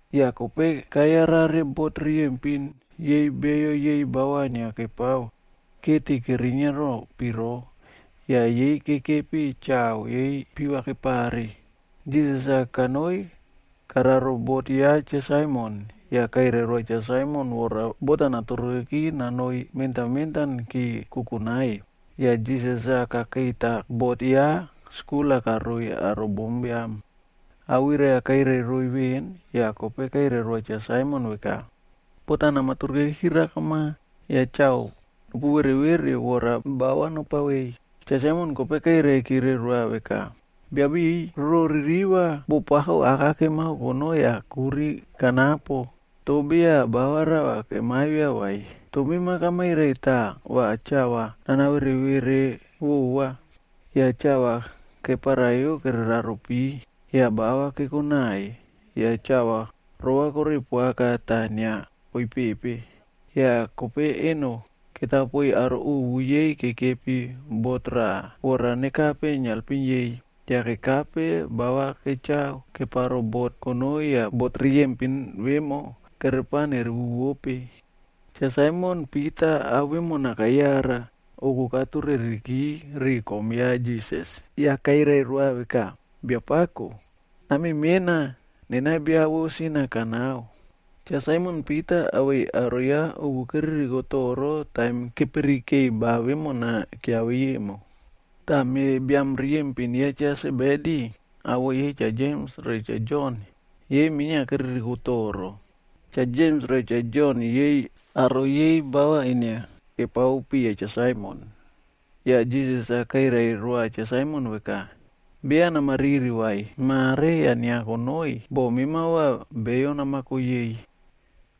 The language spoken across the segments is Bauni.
Yah kope kayarare bot riyempin yei beyo yei bava inia kepao keti kerinia ro piro, yah yei kekepi chao yei piva kepare. Jisas-a kanoi kararo bot ya Cha Saimon yah kairai roa Cha Saimon vora bot-a naturuke nonoi mentan mentanki kukunai. Yah Jisas-a kakeita bot yah skul-a karoiy aro bombiam. Awirai-a kairai roiy veꞌen yah kope kairai roa Cha Saimon veka, “Bot nama turukeki rakama yah chao nopu vere vere vora bava nopawei.” Cha Saimon kope kairai kire roa veka, “Biabiꞌiy, roro ririva, boꞌo pako aka kemao konoi yah kuri kanapo toh beya ba rava kemavia vai. Toh mema kamairai tah va chao va nana vere vereyo vova.” Yah chao keparai kereraro pi, yah bava kekonai yah chao rovakore poaka tah inia koipepe. Yah kope eno ketapoiy aro ovu yei kekepi bot raꞌa, vora nekape nealpim yei. Yah kekape bava kechao keparo bot konoi yah bot riyempin vemo, kerepao nerewuwope. Cha Saimon Pita ao vemona kayara, oku katureriki ri kom ya Jisas yah kairai roa veka, “Biapako, name mena, nena bia vo sin-a kanao.” Cha Saimon Pita awei aro ya ovu keririkope toro taim kepirikei ba vemona kiavei emo. Tah me biam riyempin ya Cha Sebedi, awoꞌo yei Cha Jems re Cha Jon, yei minia keririko toro. Cha Jems re Cha Jon yei aro yei bava inia kepao piya Cha Saimon. Yah Jisas-a kairai roa Cha Saimon veka, “Beya nama riri vai. Mare yah inia konoi, boꞌo mema va beyo namako yei.”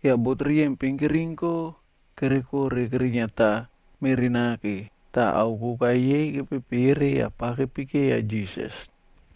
Yah bot riyempin kerinko kerekore keriniata meꞌri nake, tah ao koka yei kepepere yah pava kepekeya Jisas.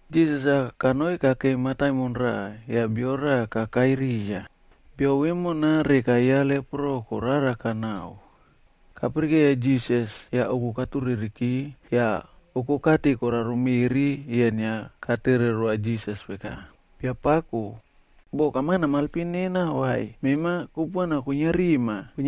Jisas-a kanoi kakei mataimon raꞌa yah bio raꞌa kakai riya. Bio vemona, reka ya lepro koraraka naꞌao. Kapirikeiya Jisas, yah oku katureriki yah oko kati koraro meꞌri yah inia katere roa Jisas veka, “Biapako, boh kama namaelpim nena vai, mema kupuana kwinia rima,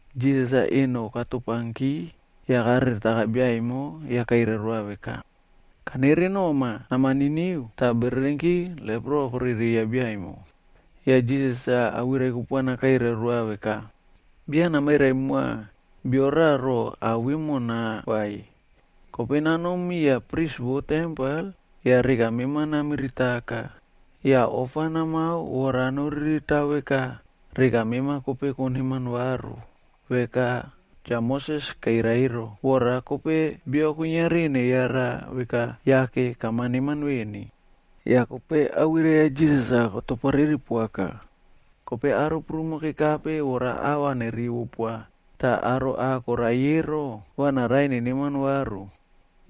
Jisas-a eno katopanki yah kareretaka bia emo yah kairai roa veka, “Kanere noma. Nama niniu.” Tah bererenki lepro korereiya biaemo. Yah Jisas-a awirai kupuana kairai roa veka, “Beya namairai moa bio raꞌa roꞌo ao vemona vai. Kope nanom miya pris vo tempel yah reka mema namiritaka, yah ofa namao vora noriritao veka reka mema kope koneman varu veka Cha Moses kairai ero, vora kope bio kuiniari neyara veka yake kama neman veni.” Yah kope awirai ya Jisas-a kotoporeri poaka. Kope aro prumo kekape vora ava nerivo poa tah aro ah koraiy ero, va naraiy neneman varu.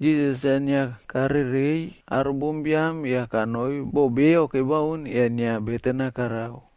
Jisas-a inia karerei aro bombiam yah kanoi bo beyo kebaun yah inia beten-a karao.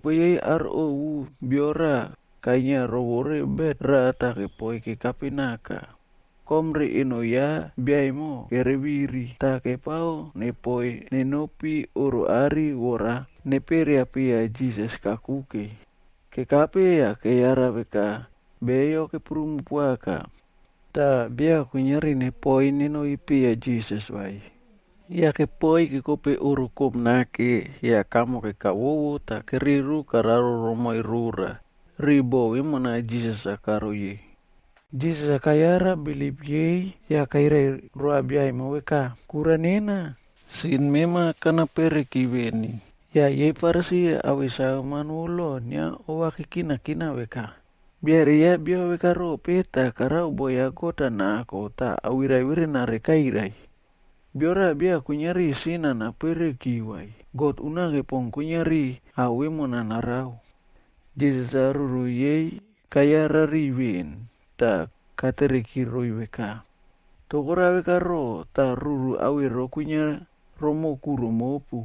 Kope yei aro ovu bio raꞌa kainia rovore bet raꞌa tah kepoiy kekape naka, kom re eno ya bia emo kereviri, tah kepao nepoi nenopi oꞌro are vora neperiao piya Jisas-a kakuke. Kekape yah keyara veka beyo keprumo poaka tah beya kuiniari nepoi nenopi piya Jisas vai. Yah kepoi kekope oꞌro koꞌom nake yah kamo kekavovo tah kereru kararo romoiy rora, riu bo vemona Jisas-a karoiy-e. Jisas-a kayara bilip yei yah kairai roa bia emo veka, “Kura nena, sin mema kanapereki veni.” Yah yei Farisi awei saveman vo loc inia ova kekinakina veka, “Biaere ya bia veka rope tah karao boꞌo ya God-a nako, tah awirai verenare kairai? Bio raꞌa beya kuiniari sin-a napereuki vai. God unake pon kuiniari sin-a napereuki.” Jisas-a ruru yei kayara veꞌen tah katere roiy veka, “Toh korao veka rope tah ruru veka kwinia romoꞌo kuro mopu?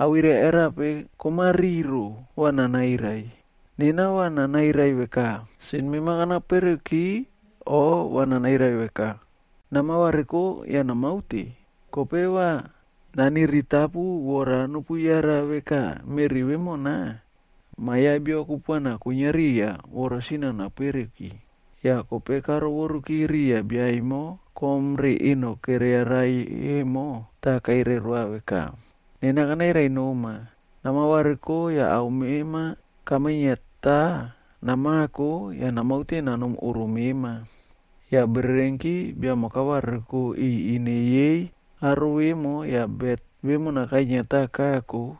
Awirai veka rope komariro rona va nanairai? Nena va nanairai veka, ‘Sin mema kana pereki’, o va nanairai veka, ‘Nama variko yah namaute?’ Toh kanao va nopuyara veka meꞌri vemona, Ma Biam ya Biod kupuana kwinia riya yah kuiniari sin-a napereuki.” Yah karovoruki riya bia emo kom-a re eno keriarai emo, tah kairai roa veka, “Kanairai noma, nama variko bet mema namako yah namaute nanom oꞌro mema.” Yah bererenki bia emo kavariko iꞌiy ine yei aro vemo yah bet vemona kainiata kako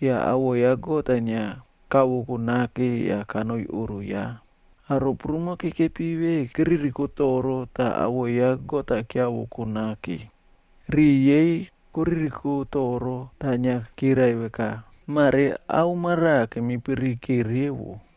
yah awoꞌo ya God-a inia kavoko nake yah kanoi oꞌro ya. Aro prumo kekepi ve keririko toro tah awoꞌo ya God-a kiavoko nake. Riꞌi yei koririko toro tah inia kirai veka, “Mare ao maraꞌa kemipirike revo!”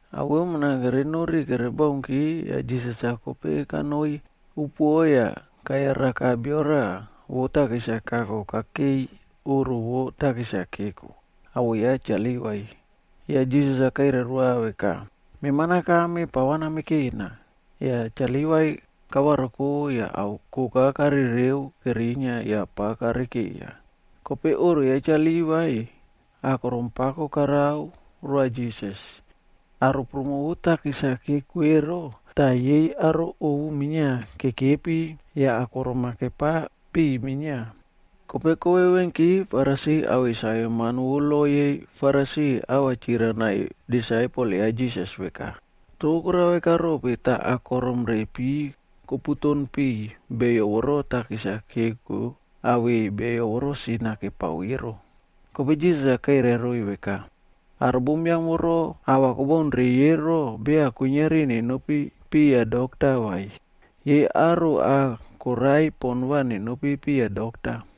Ao vemona kere nori kere baunki yah Jisas-a kope kanoi upoꞌo yah kayaraka bio raꞌa vo takis-a kako kakei oꞌro vo takis-a keko, awoꞌo ya Cha Livai.e Yah Jisas-a kairai roa veka, “Mema nakame pava namekena.” Yah Cha Livai kavariko yah ao koka karereu kerinia yah pa kare keiya. Kope oꞌro ya Cha Livai, akorom pako karao roa Jisas. Aro prumo vo takis-a keko ero tah yei aro ovu minia kekepi yah akorom-a kepa piꞌiy minia. Kope kovevenki Farisi awei saveman vo lo yei Farisif ava chirai naiy disaipelg ya Jisas veka, “Toh korao vekarope tah akorom re piva koputon piꞌiy beyo voro takis-a keko awei bio voro sin-a kepao ero?” Kope Jisas-a kairai roiy veka, “Aro bombiam voro ahva beya koraiy ero beya kuiniari nenopi piya dokta vai. Yei aro ah koraiy poꞌon va nenopi piya dokta.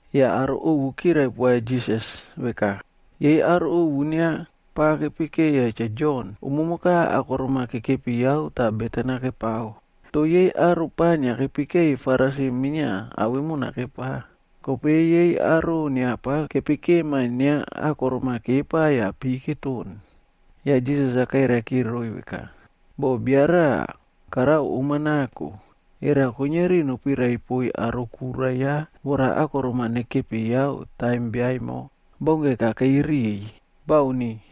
Yah aro ovu kirai poa Jisas veka, “Yei aro ovu inia pava kepekeya Cha Jon, umumoka akorom-a kekepi yao tah beten-a kepao. Toh yei aro pa inia kepekeiy Farisi minia ao vemona kepao. Kope yei aro inia pava kepekema inia akorom-a kepa yah pi va keton.” Yah Jisas kairai kire roiy veka, Boh bia raꞌa karao om-a nako, era kuiniari nopirai poiy aro kura ya vora akorom-a nekepi yao taim bia emo baunke kakei riꞌiy? Bauni.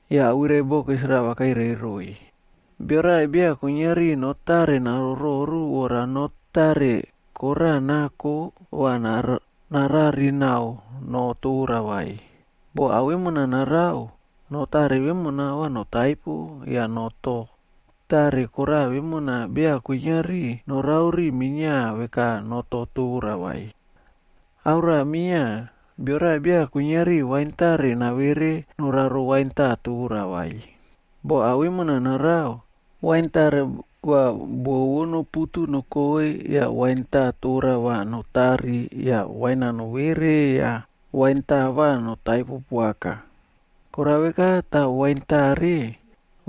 Yah awirai bokis rava kairai roiy, “Bio raꞌa beya kuiniari noh tare narororu vora noh to tare koraꞌa nako va narari nao noh tora vai. Boh ao vemona narao, noh tare vemona va notaipo yah noh to tare koraꞌa vemona beya kuiniari norao ri minia veka noh to tora vai. Ao raꞌa minia, bio raꞌa beya kuiniari wain tare navere noraro wain taꞌa tora vai. Boh ao vemona narao, wain tare va buo vo noputu nokoi yah wain taꞌa tora va notari yah wain-a nowere yah wain taꞌa va notaipo poaka. Korao veka tah wain tare,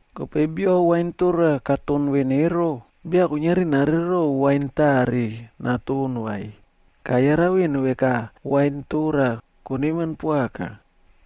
Kope bio wain tora katon veꞌen ero, beya kuiniari narerero wain tare naton vai. Kayara veꞌen veka, ‘Wain tora koneman poaka.’”